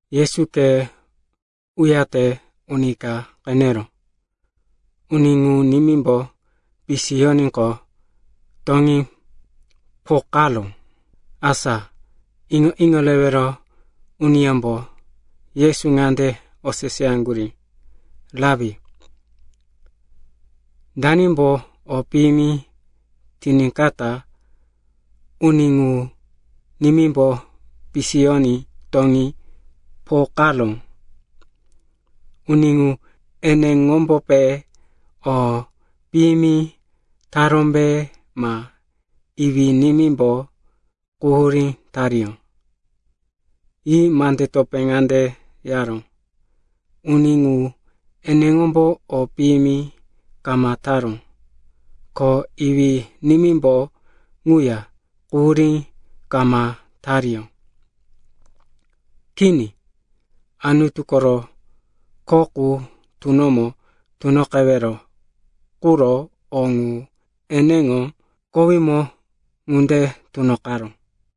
Yesu khe uyate, uni ka qeneró. Uni ŋu nimímbo pisiyoníqo, toŋí pokaró. Asa iŋo-iŋo rewero uniyómbo Yesu ŋande oseseyaŋgurí, “Rapi, danimbo o piyimi tiníkata uni ŋu nimímbo pisiyoní toŋí pokaró? Uni ŋu eneŋombope o piyimi tarómbe ma iwí-nimímbo quhurí tariyó?” Yi mande topé ŋande yaró, “Uni ŋu eneŋombo o piyimi kama taró, ko iwí-nimímbo ŋuya quhurí kama tariyó. Kini, Anutu koro kho qu tunomo tunoqewero quro o ŋu eneŋo kowímo ŋunde tunoqaró.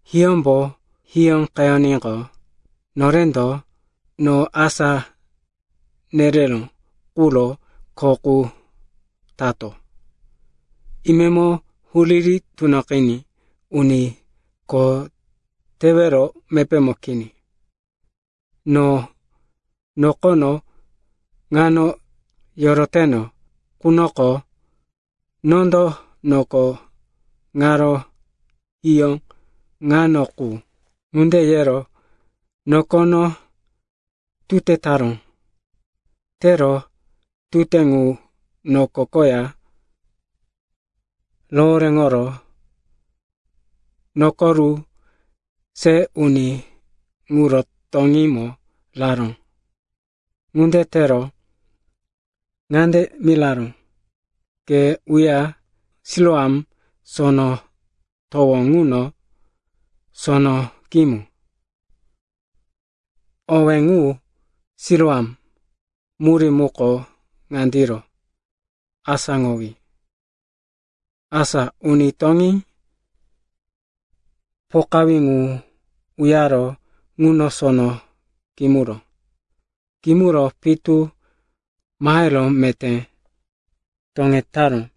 Hiyómbo hiyóqeyoníqo, norendo no asá nereró quro kho qu tato. Imemo huriri tunoqiní uni kho tewero mepémo kini. No nokono ŋano yoroteno qunoko, nondo noko ŋaro hiyó ŋano qu.” Ŋunde yero nokono tute taró. Tero tute ŋu noko koya rohoréŋoro nukuru se uni ŋuro toŋímo raró. Ŋunde tero ŋande miraró, “Ke uya Siloam Sono Towo ŋuno sono kimu.” (Owé ŋu “Siloam” murí muko ŋandiro, “Asáŋowí.”) Asa uni toŋí pokawí ŋu uyaro ŋuno sono kimuró. Kimuro pitu mahero meté toŋetaró.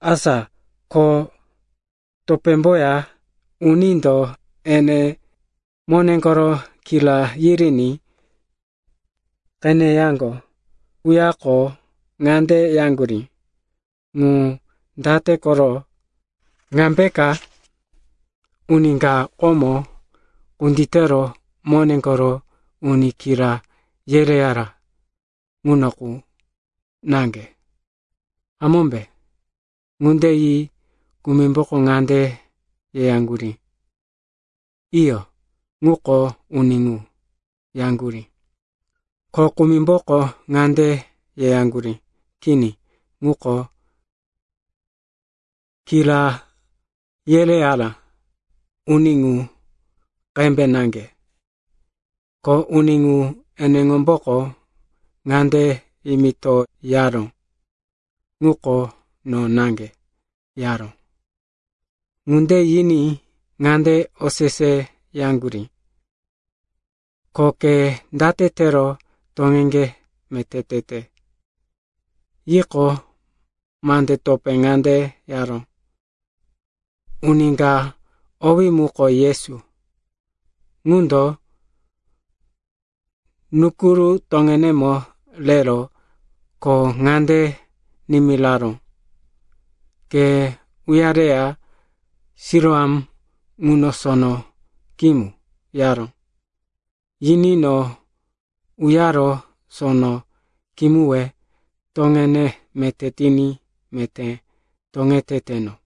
Asa ko topémboya unindo ene mone koro kira yiriní qeneyaŋgo quyako ŋande yaŋgurí, “Ŋu date koro? Ŋambeka uni ka komo kunditero mone koro uni kira yereyara ŋuno qu naŋge, hamómbe?” Ŋunde yi kumimbo ŋande yeyaŋgurí, “Iyo, ŋuko uni ŋu,” yaŋgurí. Ko kumimboko ŋande yeyaŋgurí, “Kini, ŋuko kira yereyara uni ŋu qembe naŋge.” Ko uni ŋu eneŋomboko ŋande yimitoyaró, “Ŋuko no naŋge,” yaró. Ŋunde yiní ŋande oseseyaŋgurí, “Ko ke date tero toŋeŋge meté tete?” Yiqo, mande topé ŋande yaró, “Uni ka owí muko Yesu, ŋundo nukuru toŋenemo rero ko ŋande nimiraró, ‘Ke uyareya Siloam ŋuno sono kimu,’ yaró. Yiní no uyaro sono kimuwe toŋene meté tiní meté toŋeteteno.”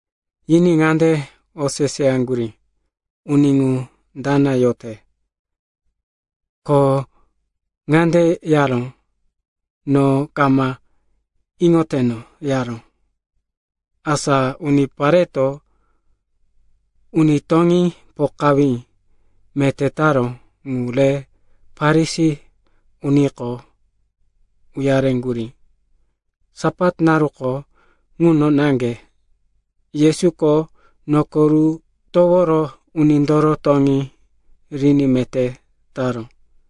Yiní ŋande oseseyaŋgurí, “Uni ŋu dana yote?” Ko ŋande yaró, “No kama iŋoteno,” yaró. Asa unipareto uni toŋí pokawí meté taró ŋu re Farisi uniko uyareŋgurí. Sapat naruko ŋuno naŋge Yesuko nukuru toworo unindoro toŋí riní meté taró.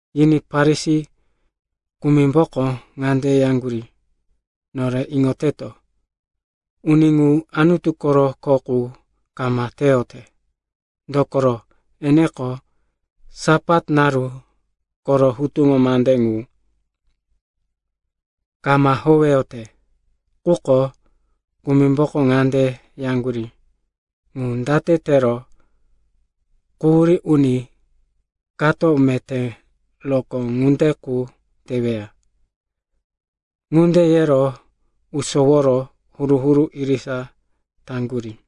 Yiní Farisi kumimboko ŋande yaŋgurí, “Nore iŋoteto, uni ŋu Anutu koro kho qu kama teyote, dokoro, eneko Sapat naru koro hutuŋo mande ŋu kama howeyote.” Quko kumimbo ŋande yaŋgurí, “Ŋu date tero quhurí uni kato meté rokó ŋunde qu teweya?” Ŋunde yero usoworo huru-huru irisa taŋgurí.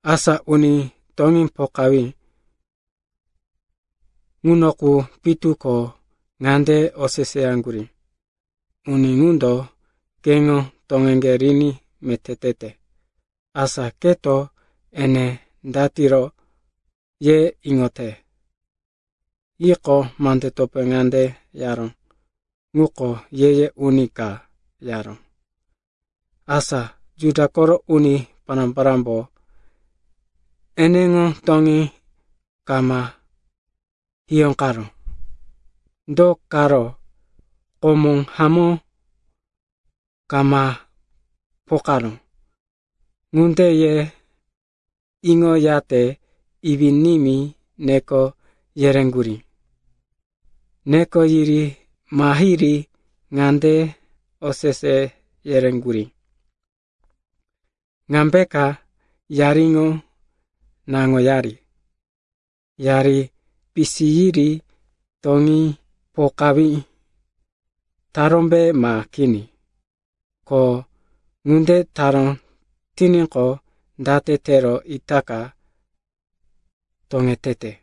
Asa uni toŋí pokawí ŋuno qu pitu ko ŋande oseseyaŋgurí, “Uni ŋundo keŋo toŋeŋge riní meté tete. Asa keto ene datiro, ye iŋote?” Yiqo, mande topé ŋande yaró, “Ŋuko ye-ye uni ka,” yaró. Asa Juda koro uni pará-parámbo, eneŋo toŋí kama hiyóqaró, do karo komo hamó kama pokaró, ŋunde ye iŋoyate iwí-nimí neko yereŋgurí. Neko yiri mahiri ŋande osese yereŋgurí, “Ŋambeka yariŋo naŋoyari? Yari pisiyiri toŋí pokawí tarómbe ma kini? Ko ŋunde taró tiníqo, date tero itaka toŋetete?”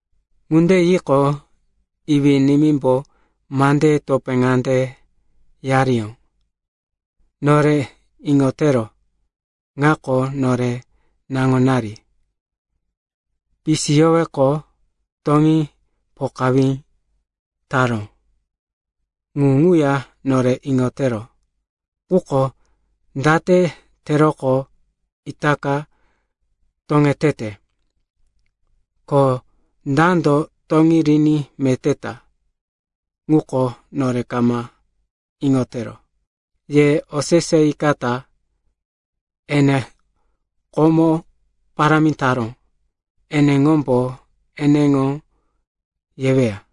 Ŋunde yiqo, iwí-nimímbo mandeye topé ŋande yariyó, “Nore iŋotero, ŋako nore naŋonari. Pisiyoweqo, toŋí pokawí taró, ŋu ŋuya nore iŋotero. Quko date teroqo itaka toŋetete, ko dando toŋí riní meté ta, ŋuko nore kama iŋotero. Ye oseseyikata. Ene komo parámi taró, eneŋombo eneŋo yeweya.”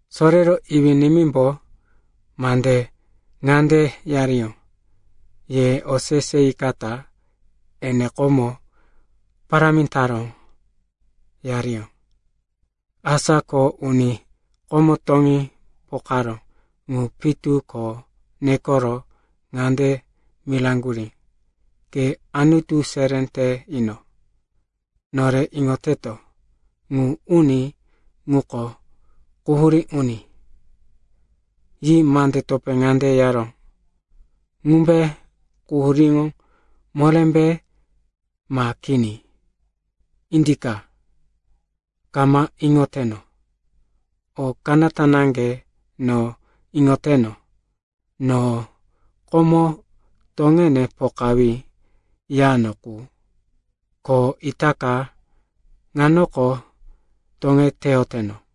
Sorero iwí-nimímbo mande ŋande yariyó, ye oseseyikata. Ene komo parámi taró, yariyó. Asa ko uni komo toŋí pokaró ŋu pitu ko nekoro ŋande miraŋgurí, “Ke Anutu seré te ino. Nore iŋoteto, ŋu uni ŋuko quhurí uni.” Yi mande topé ŋande yaró, “Ŋumbe quhuríŋo morémbe ma kini, indika, kama iŋoteno. O kanata naŋge no iŋoteno, no komo toŋene pokawí yano qu, ko itaka ŋanoko toŋeteyoteno.”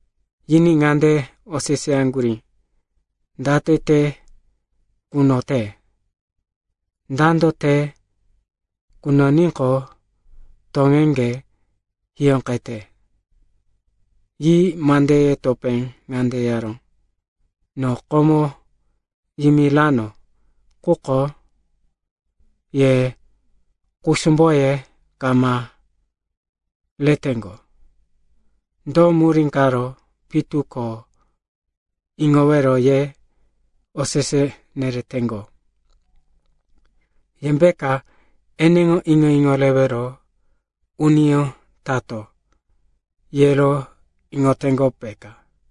Yiní ŋande oseseyaŋgurí, “Date te kunote? Dando te kunoníqo toŋeŋge hiyóqete?” Yi mandeye topé ŋande yaró, “No komo yimirano, quko ye kusumboye kama reteŋgo. Do murí karo pitu ko iŋowero ye osese nereteŋgo? Yembeka eneŋo iŋo-iŋo rewero uniyó tato, yero iŋoteŋgo, peka?”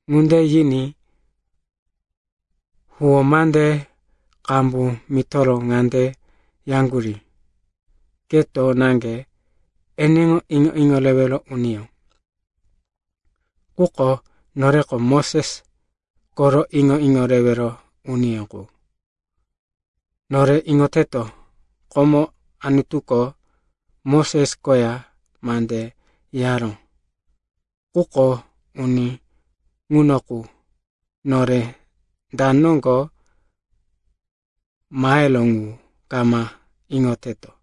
Ŋunde yiní huwó mande qambu mitoro ŋande yaŋgurí, “Keto naŋge eneŋo iŋo-iŋo rewero uniyó. Quko noreko Moses koro iŋo-iŋo rewero uniyó qu. Nore iŋoteto, komo Anutuko Moses koya mande yaró. Quko uni ŋuno qu, nore da noŋgo maheró ŋu kama iŋoteto.”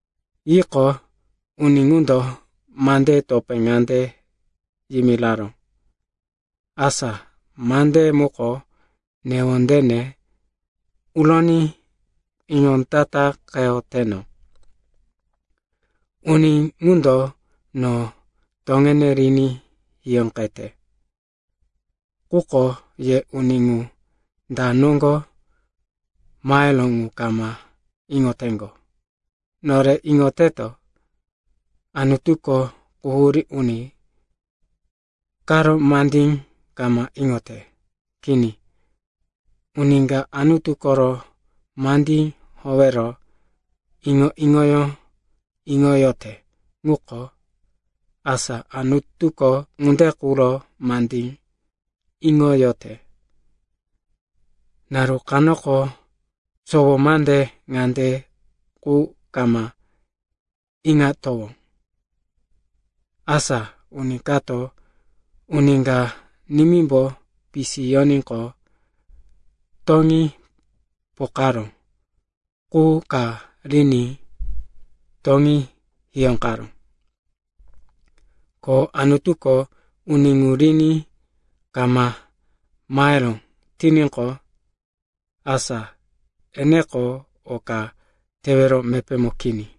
Yiqo, uni ŋundo mandeye topé ŋande yimiraró, “Asa mandeye muko newondene uroní iŋondataqeyoteno! Uni ŋundo no toŋene riní hiyóqete, quko ye uni ŋu da noŋgo maheró ŋu kama iŋoteŋgo. Nore iŋoteto, Anutuko quhurí uni karo mandí kama iŋote. Kini, uni ka Anutu koro mandí howero iŋo-iŋoyó iŋoyote ŋuko, asa Anutuko ŋunde quro mandí iŋoyote. Naru kanoko sowo mande ŋande qu kama iŋatowó, asa uni kato uni ka nimímbo pisiyoníqo, toŋí pokaró qu ka riní toŋí hiyóqaró. Ko Anutuko uni ŋu riní kama maheró tiníqo, asa eneko o ka tewero mepémo kini.”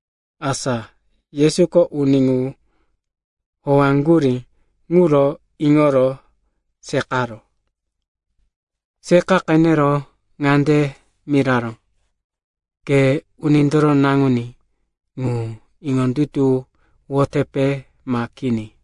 Asa Yesuko uni ŋu howaŋgurí ŋuro iŋoro seqaró. Seqa qenero ŋande miraró, “Ke Unindoro Naŋuní ŋu iŋondutuwoyotepe ma kini?”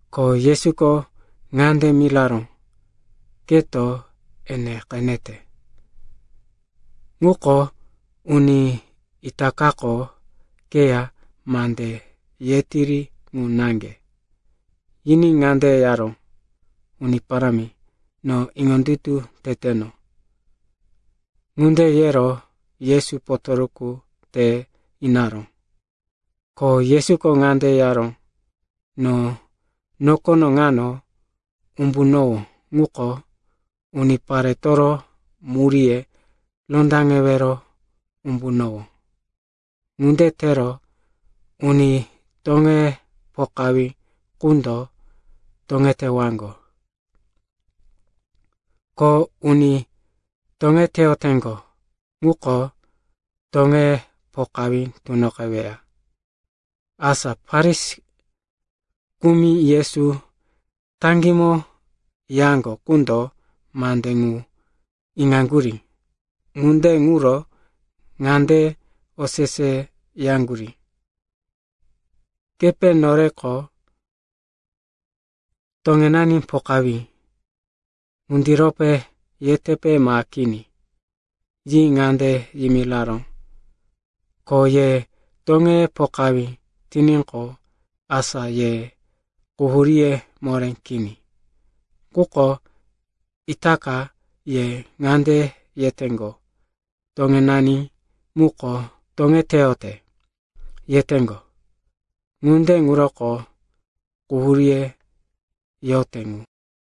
Ko Yesuko ŋande miraró, “Keto ene qenete. Ŋuko uni itakako keya mande yetiri ŋu naŋge.” Yiní ŋande yaró, “Uni Parámi, no iŋondutu teteno.” Ŋunde yero Yesu potoruku te inaró. Ko Yesuko ŋande yaró, “No nokono ŋano umbunowó ŋuko uniparetoro muríye rondaŋewero umbunowó. Ŋunde tero uni toŋeye pokawí qundo toŋetewaŋgo, ko uni toŋeteyoteŋgo ŋuko toŋeye pokawí tunoqeweya.” Asa Farisi kumi Yesu taŋgímo yaŋgo qundo mande ŋu iŋaŋgurí. Ŋunde ŋuro ŋande oseseyaŋgurí, “Kepe noreko toŋenani pokawí, ŋundirope yetepe ma kini?” Yi ŋande yimiraró, “Ko ye toŋeye pokawí tiníqo, asa ye quhuríye moré kini. Quko itaka ye ŋande yeteŋgo, ‘Toŋenani muko toŋeteyote,’ yeteŋgo. Ŋunde ŋuroko quhuríye yote ŋu.